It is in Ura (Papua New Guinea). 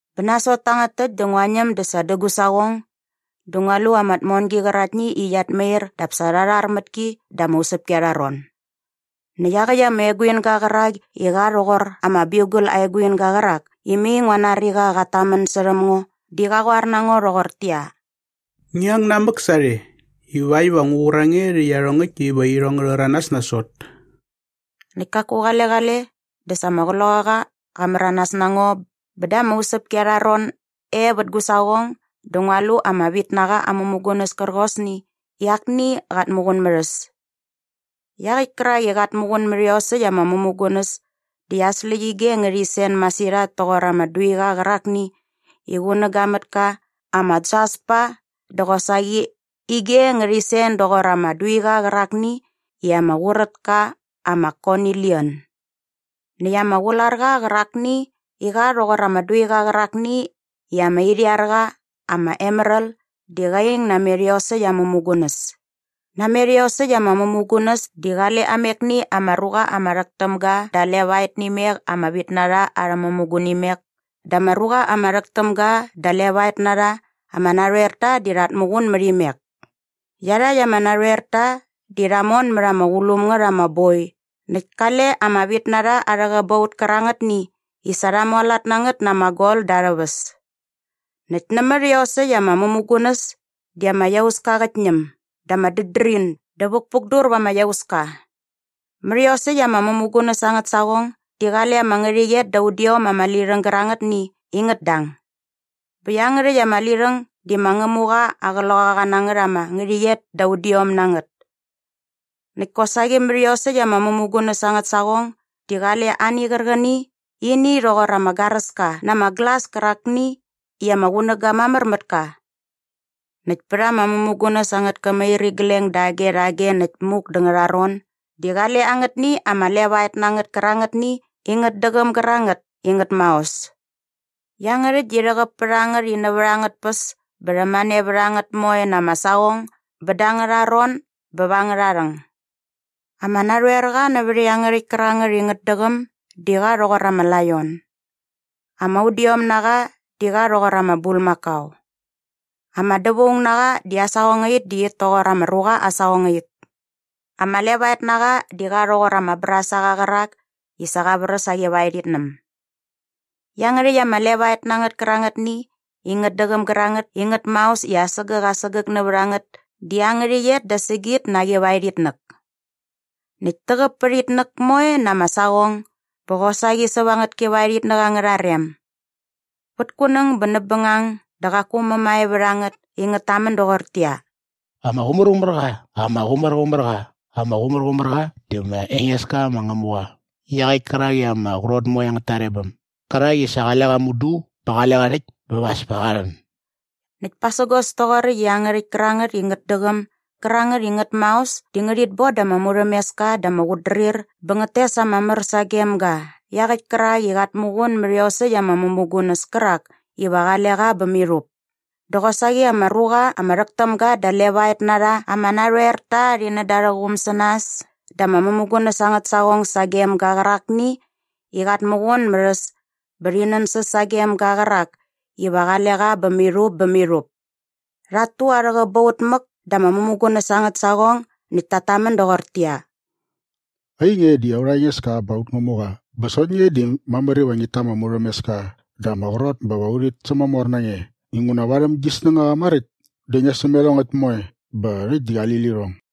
Bä nasot tangät täkt dä ngua ñäm dä sa dä gu saqong dä ngua lu ama tmongi qäraktni i qiat mair dap sa rha rhar mät ki da ama usäpki arha ron. Näkt iaqäkt ama eguinga qärak i qa rhoqor ama biugal aa eguinga qärak i mai ngua nari i qat tamän särhäm ngo di qa qoar na ngo rhoqortäqyia, “Ngi ang namäk sarhe ivakt iva ngu qur a nge rhä iarhongäkt iva irhong ngä rhäranas nasot.” Näkt kaku qale qale dä sa ama Qloqaqa qa märanas na ngo bä da ama usäpki arha ron e vät gu saqong dä ngua lu ama vitnaqa aa mämugunäs kärqosni i akni qat muqun mät äs. Iaqäkt kärak i qat muqun mät iosäkt ama mämugunäs di aa släqyige ngärhi sen masirhat toqor ama duiqa qärakni i qunäga mät ka ama jaspa dä qosaqi ige ngärhi sen doqor ama duiqa qärakni i ama qurät ka ama konilian. Näkt ama qularqa qärakni i qa rhoqor ama duiqa qärakni i ama irhiar qa ama emeral di qa ing namet iosäkt ama mämugunäs. Namet iosäkt ama mämugunäs di qale amekni ama ruqa ama rhäk täm ga da levaet nä imek ama vitnarha arhä mämugunimek dä ama ruqa ama rhäk täm ga da levaet na rha ama narhoerta di rhat muqun mät imek. Iarhakt ama narhoerta di rha mon mät ama qulum ngät ama boi näkt kale ama vitnarha arhä qäbaut kärangätni i sa rha mualat na ngät na ama gol da arhä väs. Näkt nämät iosäkt ama mämugunäs di ama iauska qät ñäm dä ama dädrin dä vukpukdur va ama iauska. Mät iosäkt ama mämugunäs angät saqong di qale ama ngärhäqyet da udiom ama lirhäng gärangätni i ngät dang. Bä iangärhäkt ama lirhäng di ma Ngämuqa aa qloqaqanangät ama ngärhäqyet da udiom na ngät. Näkt kosaqi mät iosäkt ama mämugunäs angät saqong di qale ani qärqäni i ini rhoqor ama garäska na ama glas kärakni i ama qunäga mamär mät ka. Näkt pät ama mämugunäs angät kämirigleng dage rhage näkt muk dä ngärharon di qale angätni ama levaet na ngät kärangätni i ngät däqäm gärangät i ngät maos. Iangärhäkt di rhäqäp pät a ngät i nävät angät tpäs bä rhämane vät a ngät moe na ama saqong bä da angärha ron bä va angärha rhäng. Ama narhoerqa nävät iangärhäkt kärangät i ngät däqäm di qa rhoqor ama laion. Ama udiomnaqa di qa rhoqor ama bulmakao. Ama dävaungnaqa di aa saqongait di it toqor ama ruqa aa saqongait. Ama levaetnaqa di qa rhoqor ama brasaqa qärak ni i sa qa vräs aa qivaerhitnäm. Iangärhäkt ama levaet na ngät kärangätni i ngät däqäm gärangät i ngät maos di asägäk asägäk nävät a ngät di aa ngärhäqyet da sägit na aa qivaerhitnäk. Näkt täqäp pät a ngät moe na ama saqong bä qosaqi säva angät kivaerhitnäk angärha rem. Vät kunäng bä näp bängang dä qaku mämae vät a ngät i ngät tamän doqortäqyia, “Ama qumärqumär qa, ama qumärqumär qa, ama qumärqumär qa di ma Engeska ma Ngämuqa iaqäkt kärak i ama qrot moe angät tarebäm gärak i sa qale qa mudu bä qale qa rhäkt bä va as pa qa rhän.” Näkt pasägos toqoräkt i iangärhäkt kärangät i ngät däqäm gärangät i ngät maos di ngärhit bon da ama murhämeska dä ama qutdrir bä ngät tes ama mär sagem ga iaqäkt kärak i qat muqun mät iosäkt ama mämugunäs kärak iva qale qa bä mirhup dä qosaqi ama ruqa ama rhäk täm ga da levaet na rha ama narhoerta rhi nän da arhä quum sä nas da ama mämugunäs angät saqong sagem ga qärakni i qat muqun mät äs bä rhi nänsäs sagem ga qärak iva qale qa bä mirhup bä mirhup. Rhat tu arhä qäbaut mäk da ama mämugunäs angät saqong näkt tat tamän doqortäqyia, “Ainge di aurha Engeska bä aut Ngämuqa bä sokt nge di mamär iva ngit ta ama murhämeska dä ama qrot bä va rhit sämamor na nge inguna varhäm gi snängaqa maräkt dä ngia säm iarhongäkt moe bä rhäkt di qali lirhong.”